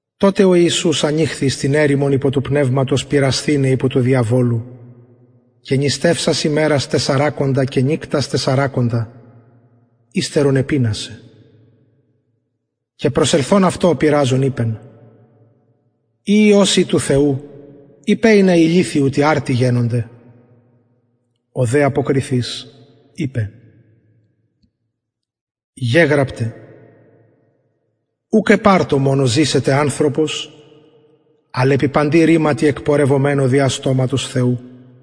τοτε ο ιησους ανηχθη εις την ερημον υπο του πνευματος πειρασθηναι υπο του διαβολου και νηστευσας ημερας τεσσαρακοντα και νυκτας τεσσαρακοντα υστερον επεινασεν και προσελθων αυτω ο πειραζων ειπεν ει υιος ει του θεου ειπε ινα οι λιθοι ουτοι αρτοι γενωνται ο δε αποκριθεις ειπεν γεγραπται ουκ επ αρτω μονω ζησεται ανθρωπος αλλ επι παντι ρηματι εκπορευομενω δια στοματος θεου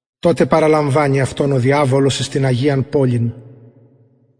τοτε παραλαμβανει αυτον ο διαβολος εις την αγιαν πολιν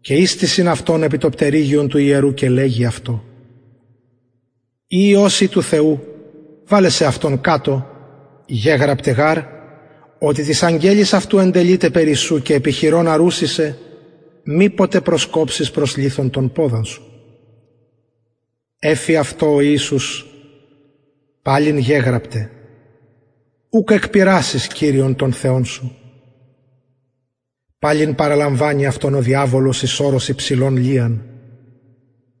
και ιστησιν αυτον επι το πτερυγιον του ιερου και λεγει αυτω ει υιος ει του θεου βαλε σεαυτον κατω γεγραπται γαρ οτι τοις αγγελοις αυτου εντελειται περι σου και επι χειρων αρουσιν σε μηποτε προσκοψης προς λιθον τον ποδα σου εφη αυτω ο ιησους παλιν γεγραπται ουκ εκπειρασεις κυριον τον θεον σου παλιν παραλαμβανει αυτον ο διαβολος εις ορος υψηλον λιαν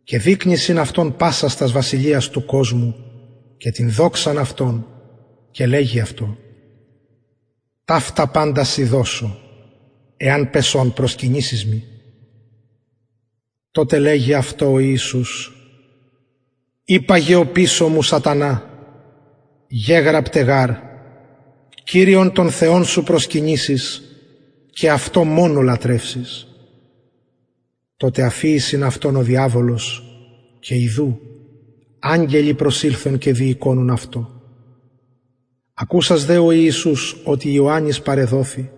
και δεικνυσιν αυτω πασας τας βασιλειας του κοσμου και την δοξαν αυτων και λεγει αυτω ταυτα παντα σοι δωσω εαν πεσων προσκυνησης μοι τοτε λεγει αυτω ο ιησους υπαγε οπισω μου σατανα γεγραπται γαρ κυριον τον θεον σου προσκυνησεις και αυτω μονω λατρευσεις τοτε αφιησιν αυτον ο διαβολος και ιδου αγγελοι προσηλθον και διηκονουν αυτω ακουσας δε ο ιησους οτι ιωαννης παρεδοθη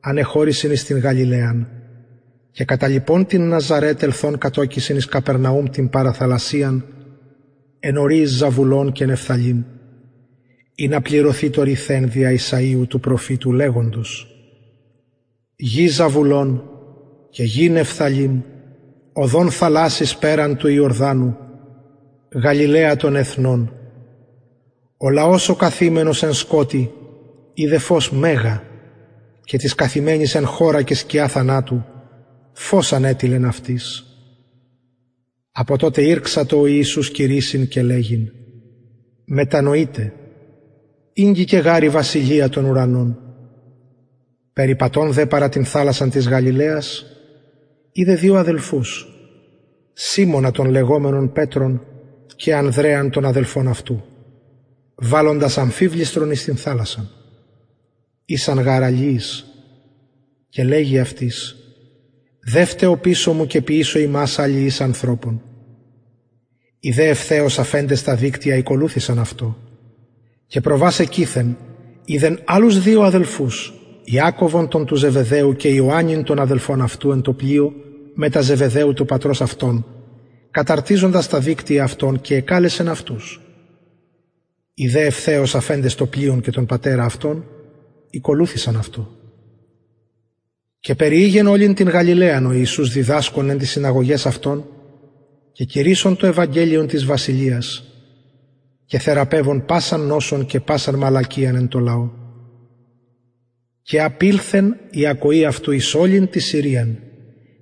ανεχωρησεν εις την γαλιλαιαν και καταλιπων την ναζαρετ ελθων κατωκησεν εις καπερναουμ την παραθαλασσιαν εν οριοις ζαβουλων και νεφθαλειμ ινα πληρωθη το ρηθεν δια ησαιου του προφητου λεγοντος γη ζαβουλων και γη νεφθαλειμ οδον θαλασσης περαν του ιορδανου γαλιλαια των εθνων ο λαος ο καθημενος εν σκοτει ειδεν φως μεγα και τοις καθημενοις εν χωρα και σκια θανατου φως ανετειλεν αυτοις απο τοτε ηρξατο ο ιησους κηρυσσειν και λεγειν μετανοειτε ηγγικεν γαρ η βασιλεια των ουρανων περιπατων δε παρα την θαλασσαν της γαλιλαιας ειδεν δυο αδελφους σιμωνα τον λεγομενον πετρον και ανδρεαν τον αδελφον αυτου βαλλοντας αμφιβληστρον εις την θαλασσαν ησαν γαρ αλιεις και λεγει αυτοις δευτε οπισω μου και ποιησω υμας αλιεις ανθρωπων οι δε ευθεως αφεντες τα δικτυα ηκολουθησαν αυτω και προβας εκειθεν ειδεν αλλους δυο αδελφους ιακωβον τον του ζεβεδαιου και ιωαννην τον αδελφον αυτου εν τω πλοιω μετα ζεβεδαιου του πατρος αυτων καταρτιζοντας τα δικτυα αυτων και εκαλεσεν αυτους οι δε ευθεως αφεντες το πλοιον και τον πατερα αυτων ηκολουθησαν αυτω και περιηγεν ολην την γαλιλαιαν ο ιησους διδασκων εν ταις συναγωγαις αυτων και κηρυσσων το ευαγγελιον της βασιλειας και θεραπευων πασαν νοσον και πασαν μαλακιαν εν τω λαω και απηλθεν η ακοη αυτου εις ολην την συριαν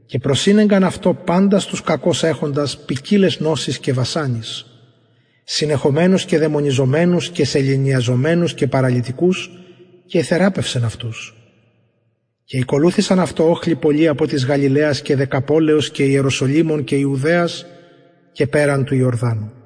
και προσηνεγκαν αυτω παντας τους κακως εχοντας ποικιλαις νοσοις και βασανοις συνεχομενους και δαιμονιζομενους και σεληνιαζομενους και παραλυτικους και εθεραπευσεν αυτους και ηκολουθησαν αυτω οχλοι πολλοι απο της γαλιλαιας και δεκαπολεως και ιεροσολυμων και ιουδαιας και περαν του ιορδανου